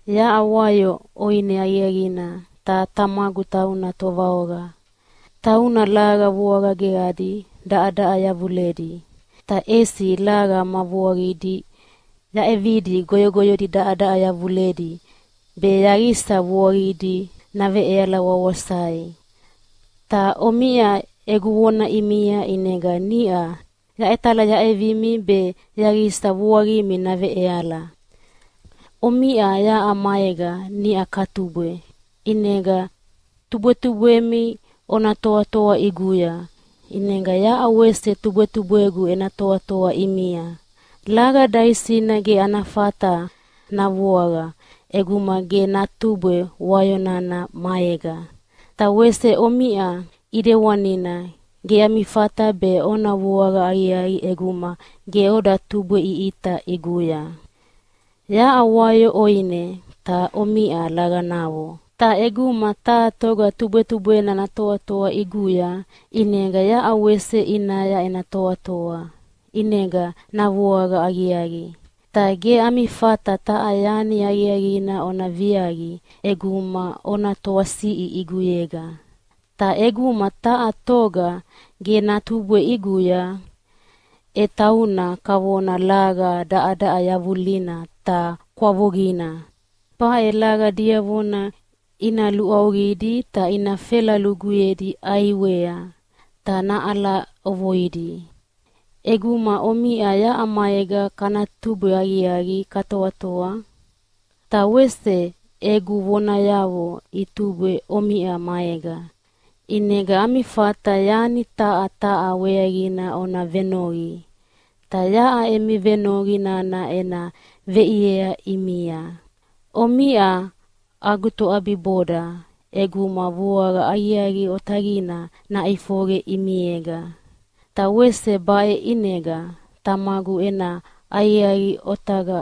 “Yaʼa wayo ʼoine aqiaqina, ta Tamagu tauna tovaoqa. Tauna laqa vuaqa geqadi daʼadaʼa yavuledi, ta ʼesi laqa ma vuaqidi yaʼevidi goyogoyodi daʼadaʼa yavuledi be yaqisa vuaqidi naveʼeala wawasai. Ta omiʼa egu vona ʼimia ʼinega niʼa yaʼetalayaʼevimi be yaqisa vuaqimi naveʼeala. Omiʼa yaʼa maega niʼa katubwe, ʼinega tubwetubwemi ona toatoa ʼiguya, ʼinega yaʼa wese tubwetubwegu ena toatoa ʼimia. Laqa daisina ge ana fata navuaqa ʼeguma ge datubwe wayo nana maega. Ta wese omiʼa ʼidewanina ge ami fata be ona vuaqa aqiaqi ʼeguma ge oda tubweʼiʼita ʼiguya. “Yaʼa wayo ʼoine ta omiʼa laqanavo. Ta ʼeguma taha toga tubwetubwena natoatoa ʼiguya, ʼinega yaʼa wese ʼinaya ena toatoa, ʼinega navuaqa aqiaqi. Ta ge ami fata taha yani aqiaqina ona viaqi ʼeguma ona toasiʼi ʼiguyega. Ta ʼeguma taha toga ge datubwe ʼiguya, e tauna kavona laqa daʼadaʼa yavulina ta kwavuqina. Baʼe laqa diavona ina luʼauqidi ta ina fela luguyedi ʼaiwea ta naʼala ʼovoidi. ʼEguma omiʼa yaʼa maega katubwe aqiaqi katoatoa, ta wese egu vonayavo itubwe omiʼa maega, ʼinega ami fata yani taha taha weaqina ona venoqi, ta yaʼa emi venoqi nana ena veʼiea ʼimia. Omiʼa agu toʼabiboda ʼeguma vuaqa aqiaqi otaqina naʼifoqe ʼimiega. Ta wese baʼe ʼinega Tamagu ena aqiaqi otaqa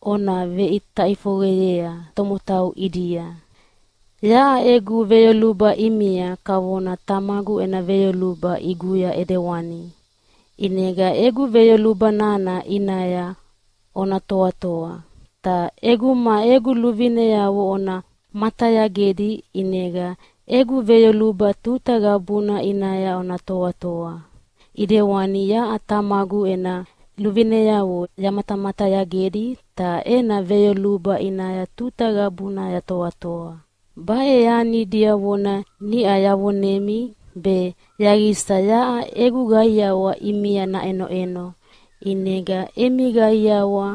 ona veʼita ʼifoqeyea tomotau ʼidia. “Yaʼa egu veyoluba ʼimia kavona Tamagu ena veyoluba ʼiguya ʼedewani. ʼInega egu veyoluba nana ʼinaya ona toatoa. Ta ʼeguma egu luvineavo ona matayagedi ʼinega egu veyoluba tuta qabuna ʼinaya ona toatoa, ʼidewani yaʼa Tamagu ena luvineavo yamatamatayagedi ta ena veyoluba ʼinaya tuta qabuna yatoatoa. Baʼe yani diavona niʼa yavonemi be yaqisa yaʼa egu qaiawa ʼimia naʼenoʼeno, ʼinega emi qaiawa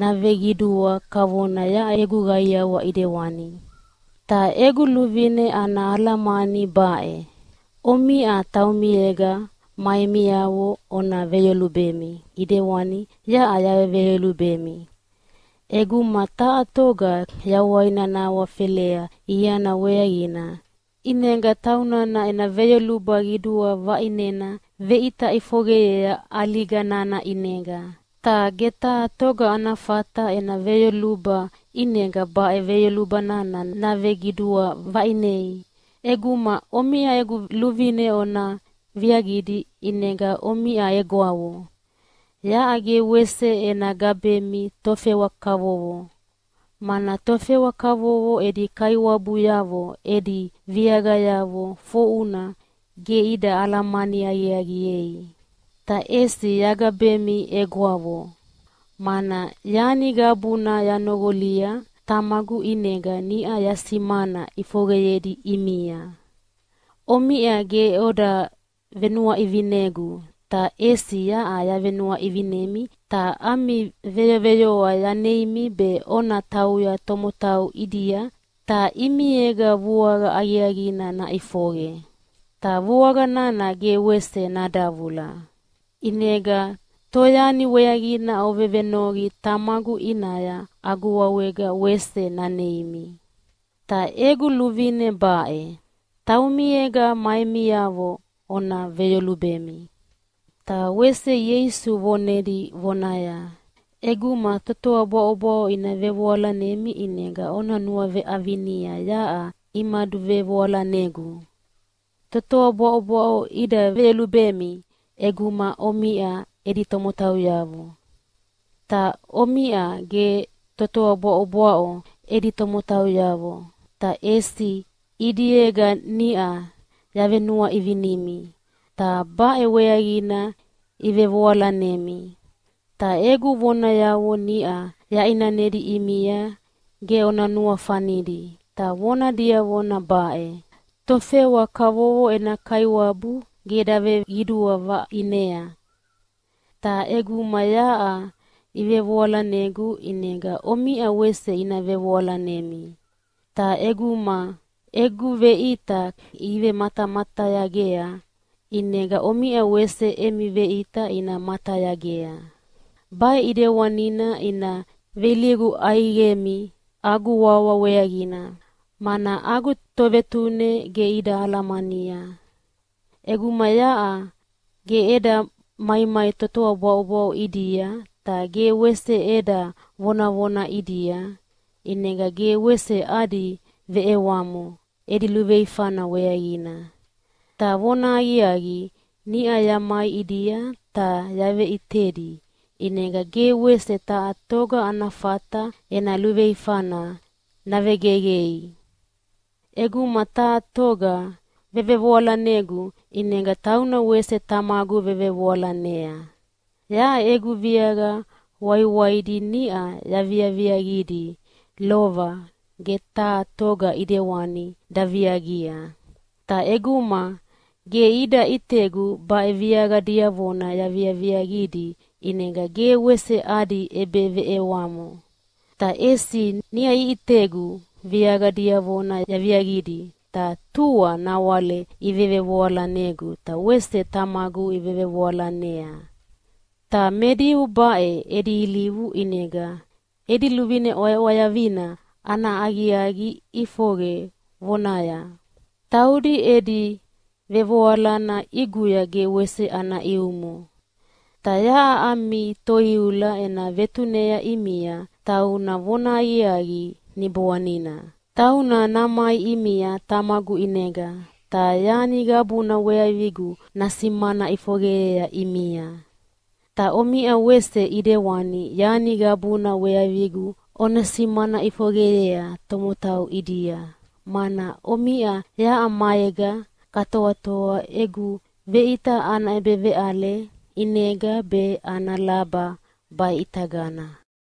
naveqidua kavona yaʼa egu qaiawa ʼidewani. “Ta egu luvine ana alamani baʼe: Omiʼa taumiega ma emiavo ona veyolubemi, ʼidewani yaʼa yaveveyolubemi! ʼEguma taha toga yawaina nahawafelea iana weaqina, ʼinega taunana ena veyoluba qidua vaʼinena veʼita ʼifoqeyea ʼaliga nana ʼinega. Ta ge taha toga ana fata ena veyoluba ʼinega baʼe veyoluba nana naveqidua vaʼinei. ʼEguma omiʼa egu luvine ona viaqidi ʼinega omiʼa egwavo. Yaʼa ge wese ena gabemi tofewa kavovo, mana tofewa kavovo edi kaiwabuyavo edi viaqayavo foʼuna ge ida alamani aqiaqiei. Ta ʼesi yagabemi egwavo, mana yani qabuna yanoqolia Tamagu ʼinega niʼa yasimana ʼifoqeyedi ʼimia. Omiʼa ge oda venuaʼivinegu, ta ʼesi yaʼa yavenuaʼivinemi ta ami veyoveyoa yaneimi be ona tauya tomotau ʼidia ta ʼimiega vuaqa aqiaqina naʼifoqe, ta vuaqa nana ge wese nadavula. ʼInega toyani weaqina ovevenoqi Tamagu ʼinaya agu wawega wese naneimi. Ta egu luvine baʼe: Taumiega ma emiavo ona veyolubemi.” Ta wese Ieisu vonedi vonaya, “ʼEguma totoa bwaʼobwaʼo ina vevoalanemi ʼinega ona nuaveʼavinia yaʼa imaduvevoalanegu. Totoa bwaʼobwaʼo ida veyolubemi ʼeguma omiʼa edi tomotauyavo. Ta omiʼa ge totoa bwaʼobwaʼo edi tomotauyavo, ta ʼesi ʼidiega niʼa yavenuaʼivinemi, ta baʼe weaqina ivevevoalanemi. Ta egu vonayavo niʼa yaʼinanedi ʼimia ge ona nuafanidi, ta vona diavona baʼe: ‘Tofewa kavovo ena kaiwabu ge daveqidua vaʼinea.’ Ta ʼeguma yaʼa ivevoalanegu, ʼinega omiʼa wese ina vevoalanemi. Ta ʼeguma egu veʼita imatamatayagea, ʼinega omiʼa wese emi veʼita ina matayagea. Baʼe ʼidewanina ina veilivu ʼaiqemi agu wawa weaqina, mana agu Tovetune ge ida alamania. ʼEguma yaʼa ge eda maimai totoa bwaʼobwaʼo ʼidia ta ge wese eda vonavona ʼidia, ʼinega ge wese adi veʼewamo edi luveifana weaqina. Ta vonahaqiaqi, niʼa yamai ʼidia ta yaveʼitedi ʼinega ge wese taha toga ana fata ena luveifana navegeqei. “ʼEguma taha toga vevevoalanegu, ʼinega tauna wese Tamagu vevevoalanea. Yaʼa egu viaqa waiwaidi niʼa yaviaviaqidi lova ge taha toga ʼidewani daviaqia. Ta ʼeguma ge ida ʼitegu baʼe viaqa diavona yaviaviaqidi, ʼinega ge wese adi ʼebeveʼewamo. Ta ʼesi niʼa iʼitegu viaqa diavona yaviaqidi, ta tua nawale ivevevoalanegu ta wese Tamagu ivevevoalanea. Ta me Diu baʼe edi ilivu ʼinega edi luvine ʼwayaʼwayavina ana aqiaqi ʼifoqe vonaya, ‘Taudi edi vevoalana ʼiguya ge wese ana ʼiumo.’ Ta yaʼa ami Toiula ena vetunea ʼimia, tauna vonahaqiaqi Niboanina. Tauna namai ʼimia Tamagu ʼinega, ta yani qabuna weaqigu nasimana ʼifoqeyea ʼimia. Ta omiʼa wese ʼidewani yani qabuna weaqigu ona simana ʼifoqeyea tomotau ʼidia, mana omiʼa yaʼa maega katoatoa egu veʼita ana ʼebeveʼale ʼinega be ana laba baʼitagana.